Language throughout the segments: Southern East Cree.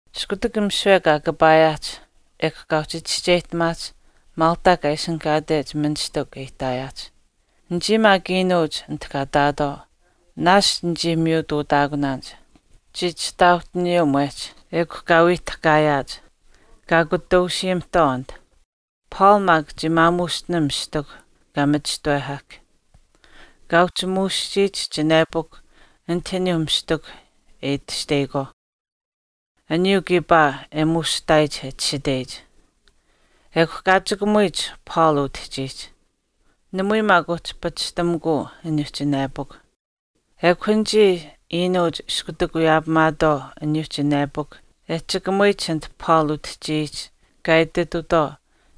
Iskutak misiwe kaa kapaayaahch, ekw kaa uhchi chischeyihtamaahch Malta kaa ishinihkaatech ministikw e ihtaayaahch. Anichii maak iinuuch anit kaa ihtaatwaau, naashch nichii miyutuutaakunaanich. Chii chihtauhtaaniyuu mwehch, ekw kaa wii tahkaayaahch, kaa kutausiyamihtwaau anit. Paul maak chii maamuushtinam mistikuh kaa machishtawehahk. Kaa uhchi muuschiyich chinepukw anit aniyuu mistikuh e itashteyikwaauh, aniyuu kiipaa e muushihtaayich e chishiteyich, ekw kaa chikamuyich Paul utihchiihch, namui maak uhchi pachishtamikuu aniyuu chinepukw. Ekw anichii iinuuch iskutak wiyaapamaatwaau aniyuu chinepukw e chikamuyich anit Paul utihchiyich kaa ititutwaau,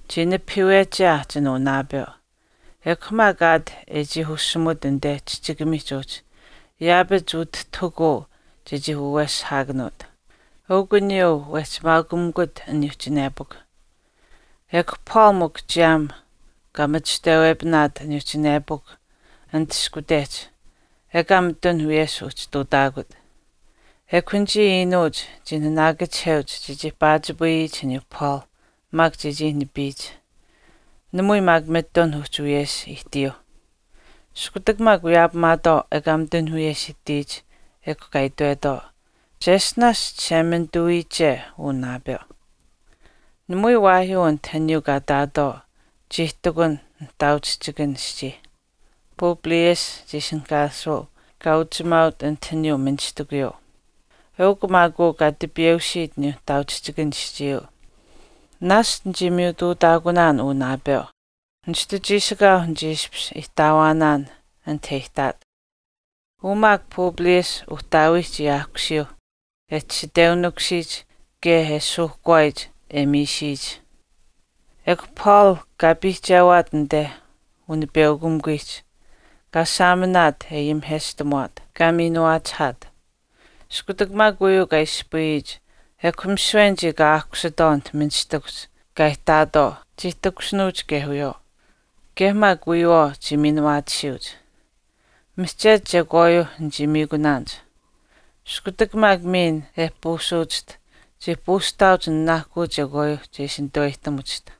“Chii nipahiiweche aahchin uu naapeu, ekw maak aat e chii ushimut anite chihchikamiihch uhchi, yaapach utihtahukuu chechii waweshihaakanuut. Eukw aniyuu wehchi maakumikut aniyuu chinepukw.” Ekw Paul mikw chiyaam kaa machishtawepinaat aniyuu chinepukw anit ishkutehch ekaa mitun wiyesh uhchi ihtuutaakut. Ekw anichii iinuuch chii naanaakachiheuch chechii paachipayiyich aniyuu Paul maak chechii nipiyich. Namui maak mitun uhchi wiyesh ihtiyuuh. Iskutak maak wiyaapamaatwaau ekaa mitun wiyesh ihtiyich ekw kaa itwetwaau, “Cheshtinaash Chishemanituuwiiche uu naapeu.” Namui waahyuu anit aniyuu kaa ihtaatwaau chii ihtakun nihtaauchihchikan aschii. Publius chii ishinihkaasuu an kaa uchimaaut anit aniyuu ministikuyuu. Eukw maak uu kaa tipiyeusiit aniyuu nihtaauchihchikan aschiiyuu. Naashch nichii miyutuutaakunaan uu naapeu. Nishtu chiishikaau nichii ishpish ihtaawaanaan anite e ihtaat. Uu maak Publius uhtaawii chii aahkusiyuu, e chishiteunikusiyich kaye e suuhkwaayich e miisiyich. Ekw Paul kaa piihchewat anite unipeukamikuwiihch, kaa saaminaat e ayimiheshtamuwaat, kaa miinuwaachihaat. Iskutak maak uyuu kaa ispayiyich, ekw misiwe anichii kaa aahkusitwaau anit ministikuhch kaa ihtaatwaau chii takushinuuch kaye wiyawaau, kaye maak wiyawaau chii miinuwaatisiyuuch. Mihchetu chekwaayuuh nichii miikunaanich. Iskutak maak miin e puusiwachiht, chii puusihtaauch nanaahkuu chekwaayuu che ishi nituweyihtamuchiht.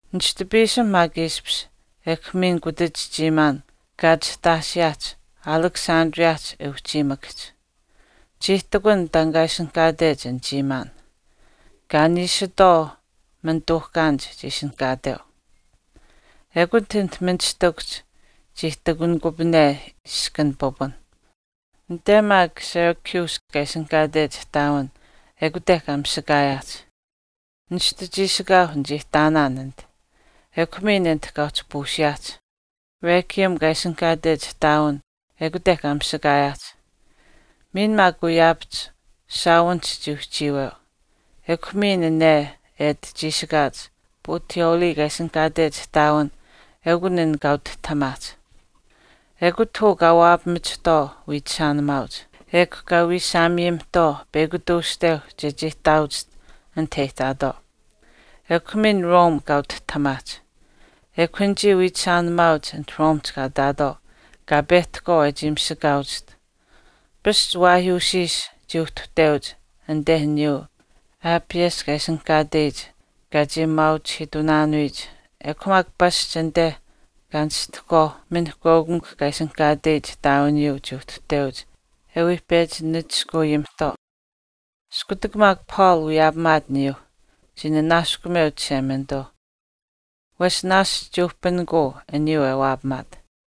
Nishtu piisim maak ishpish ekw miin kutach chiimaan kaa chihtaashiyaahch Alexandriahch e uhchiimakahch. Chii ihtakun taan kaa ishinihkaatech an chiimaan, “Kaa niishitwaau manituuhkaanich” chii ishinihkaateu. Ekut anit ministikuhch kaa ihtakuniyikupane iskan pipun. Anite maak Syracuse kaa ishinihkaatech ihtaawin ekute kaa mishikaayaahch. Nishtu chiishikaau nichii ihtaanaan anit. Ekw miin anit kaa uhchi puusiyaahch, Rhegium kaa ishinihkaatech ihtaawin ekute kaa misakaayaahch. Miin maak wiyaapahch shaawinihch chii uhchiiweu. Ekw miin ane e ati chiishikaach Puteoli kaa ishinihkaatech ihtaawin eukun an kaa utihtahamaahch. Ekut uu kaa waapamachihtwaau wiichishaanimaauch. Ekw kaa wiishaamiyamihtwaau peyakw tuushteu chechii ihtaawachiht anit e ihtaatwaau. Ekw miin Rome kaa utihtahamaahch. Ekw anichii wiichishaanimaauch anite Romehch kaa ihtaatwaau kaa pehtahkwaau e chii misakaawachiht. Pasch waahyuushiish chii uhtuhteuch anite aniyuu Appius kaa ishinihkaatech kaa chii maauchihiitunaanuyich ekw maak pasch anite Kaa Nishtihkwaau Minihkweukamikw kaa ishinihkaateyich ihtaawiniyuu chii uhtuhteuch e wii pechi nachishkuuyimihtwaau. Iskutak maak Paul wiyaapamaat aniyuu, chii nanaaskumeu Chishemanituu, wesh naashch chii uhpinikuu aniyuu e waapamaat.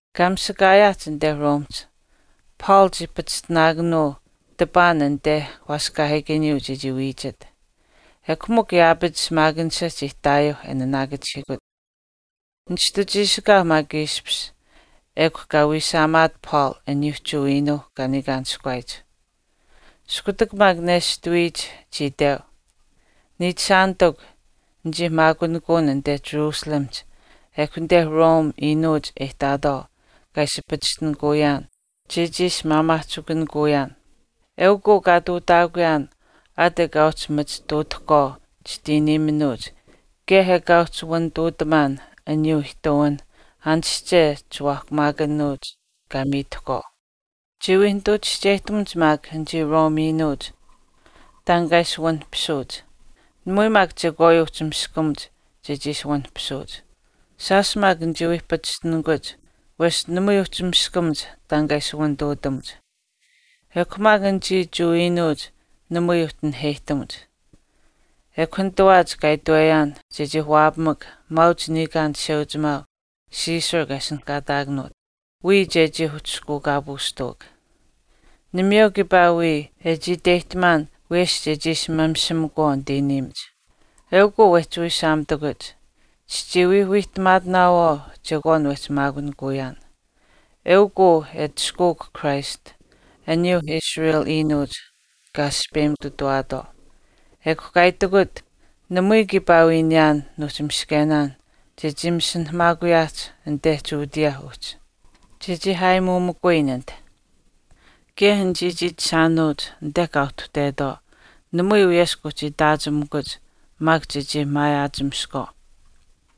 Kaa misakaayaahch anite Romehch, Paul chii pachishtinaakanuu tipaan anite waaskaahiikaniyuu chechii wiichit. Ekw mikw yaapach shimaakanisha chii ihtaayuuh e naanaakachihiikut. Nishtu chiishikaau maak ishpish ekw kaa wiishaamaat Paul aniyuu Jewa iinuuh kaa niikaanishkuwaayich. Iskutak maak neshtuwiyich chii itweu, “Niichishaanitikw, nichii maakunikuun anite Jerusalemihch ekw anite Rome iinuuch e ihtaatwaau kaa ishi pachishtinikuyaan chechii ishi maamaahchikunikuyaan. Eukw uu kaa ihtuutaakuyaan aat ekaa uhchi machituutuukwaau chitiiniiminuuch kaye ekaa uhchi wanituutamaan aniyuuh ihtuwinh aanische chiwaahkumaakanuuch kaa miitahkwaau. Chii wii nituu chischeyihtamuch maak anichii Rome iinuuch taan kaa ishi wanihpisuuch. Namui maak chekwaayuu uhchi miskamuch chechii ishi wanihpisuuch. Shaash maak nichii wii pachishtinikuch wesh namui uhchi miskamuch taan kaa ishi wanituutamuch. Ekw mikw anichii Jewa iinuuch namui uhchi naheyihtamuch, ekw nitawaach kaa itweyaan chechii waapamak maauch niikaan chisheuchimaau Caesar kaa ishinihkaataakanuut, wiya chechii uhchishkuukaapuushtawak. Namayeu kiipaa wii e chii iteyihtamaan wiyesh chechii ishi mamishimakwaau nitiiniimach. Eukw uu wehchii wiishaamitakuch. Chichii wii wiihtamaatinaawaau chekwaan wehchi maakunikuyaan, eukw uu e atushkuuk Christ aniyuu Israel iinuuch kaa aspeyimutuwaatwaau.” Ekw kaa itikut, “Namui kiipaa wii niyaan nuuhchi miskenaan chechii masinahamaakuyaahch anite Judea uhchi, chechii aayimuumikuyin anit. Kaye anichii chiichishaanuuch anite kaa uhtuhtetwaau namui wiyesh kuuhchi itaachimikuch maak chechii maayaachimiskwaau.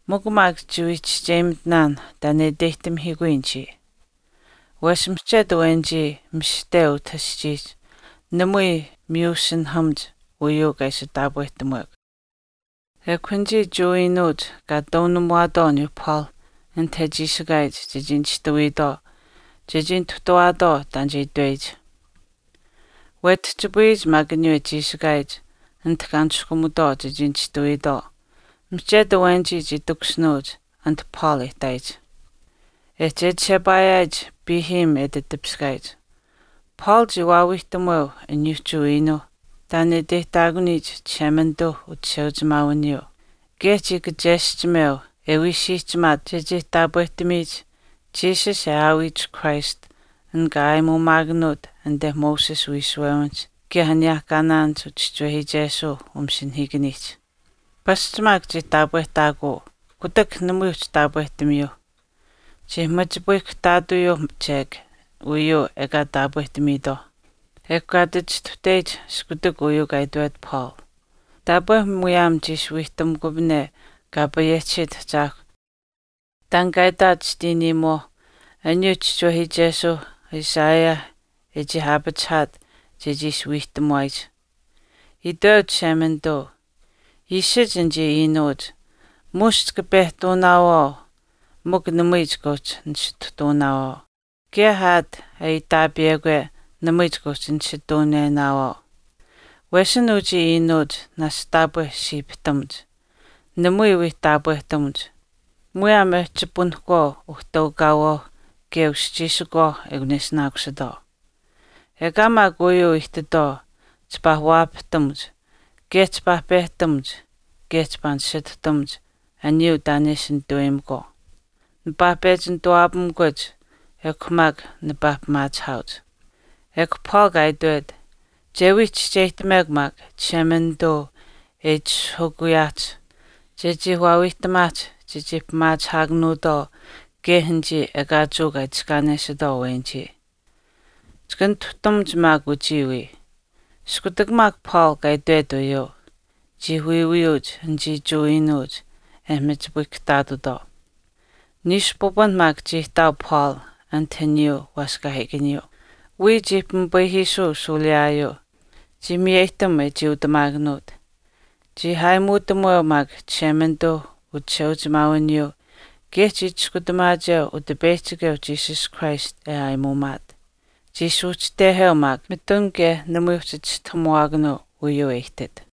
Mikw maak chiwii chischeyimitinaan taan e iteyihtamihiikuyin chiiya, wesh mihchetu awenichii mishihte uu aschii namui miyusinahamuch uyuu kaa ishi taapwehtamuwekw.” Ekw anichii Jewa iinuuch kaa wiishtuwaatwaau aniyuu Paul anit e chiishikaayich chechii nishtuwiitwaau chechii nituhtawaatwaau taan che itweyich. Wetihchipayiyich maak aniyuu e chiishikaayich anit kaa niskumutwaau chechii nishtuwiitwaau mihchetu awenichii chii takushinuuch anit Paul e ihtaayich. E chechishepaayaayich piihiim e ati tipiskaayich, Paul chii waawiihtamuweu aniyuu Jewa iinuuh taan e iteyihtaakuniyich Chishemanituu uchisheuchimaawiniyuu. Kaye chii kacheschimeu e wii siihchimaat chechii taapwehtamiyich Jesus e aawiyich Christ an kaa aayimuumaakanuut anite Moses uwiishuwewinihch kaye aniyehkaanaan uchischiwehiichesuuh umasinahiikaniihch. Pasch maak chii taapwehtaakuu, kutak namui uhchi taapwehtamiyuu. Chii machipayihkahtaatuyuu chek uyuu ekaa kaa taapwehtamiitwaau, ekw kaa ati chistuhteyich iskutak uyuu kaa itwet Paul, “Taapwe muyaam chii ishi wiihtamukupane Kaa payehchisiit Ahchaahkw taan kaa itaat chitiiniimuwaau aniyuuh uchischiwehiichesuu Isaiah e chii aapachihaat chechii ishi wiihtamuwaayich, itweu Chishemanituu, ‘Iishich anichii iinuuch, muush chika pehtenaawaau mikw namui chika uhchi nisituhtenaawaau kaye aat aitaapiyekwe namui chika uhchi nisituunenaawaau. Wesin uchii iinuuch naashch taapwe siipihtamuch, namui wii taapwehtamuch, muyaam e chipunahkwaau uhtaukaawaauh kaye uschiishikuwaau ekun e ishinaakusitwaau. Ekaa maak uyuu ihtitwaau chipaa waapahtamuch kaye chipaa pehtamuch kaye chipaa nisituhtamuch aniyuu taan e ishi nituweyimakwaau. Nipaa pechi nituwaapamikuch maak ekw maak nipaa pimaachihaauch.’” Ekw Paul kaa itwet, “Che wii chischeyihtamekw maak Chishemanituu e itishahukuyaahch chechii waawiihtamaahch chechii pimaachihaakanuutwaau kaye anichii ekaa Jewa kaa itiskaanesitwaau awenichii. Chika nituhtamuch maak uchii wii.” Iskutak maak Paul kaa itwet uyuu, chii wiiwiyuuch anichii Jewa iinuuch e machipayihkahtaatutwaau. Niishu pipun maak chii ihtaau Paul anit aniyuu waaskaahiikaniyuu. Wiya chii pimipayihiisuu shuuliyaayuu. Chii miyeyihtam e chiiutamaakanuut. Chii aayimuutamuweu maak Chishemanituu uchisheuchimaawiniyuu, kaye chii chiskutamaacheu Utipeyihchikeu Jesus Christ e aayimuumaat. Chii suuhchiteheu maak mitun kaye namui uhchi chistahamuwaakanuu uyuu e ihtit.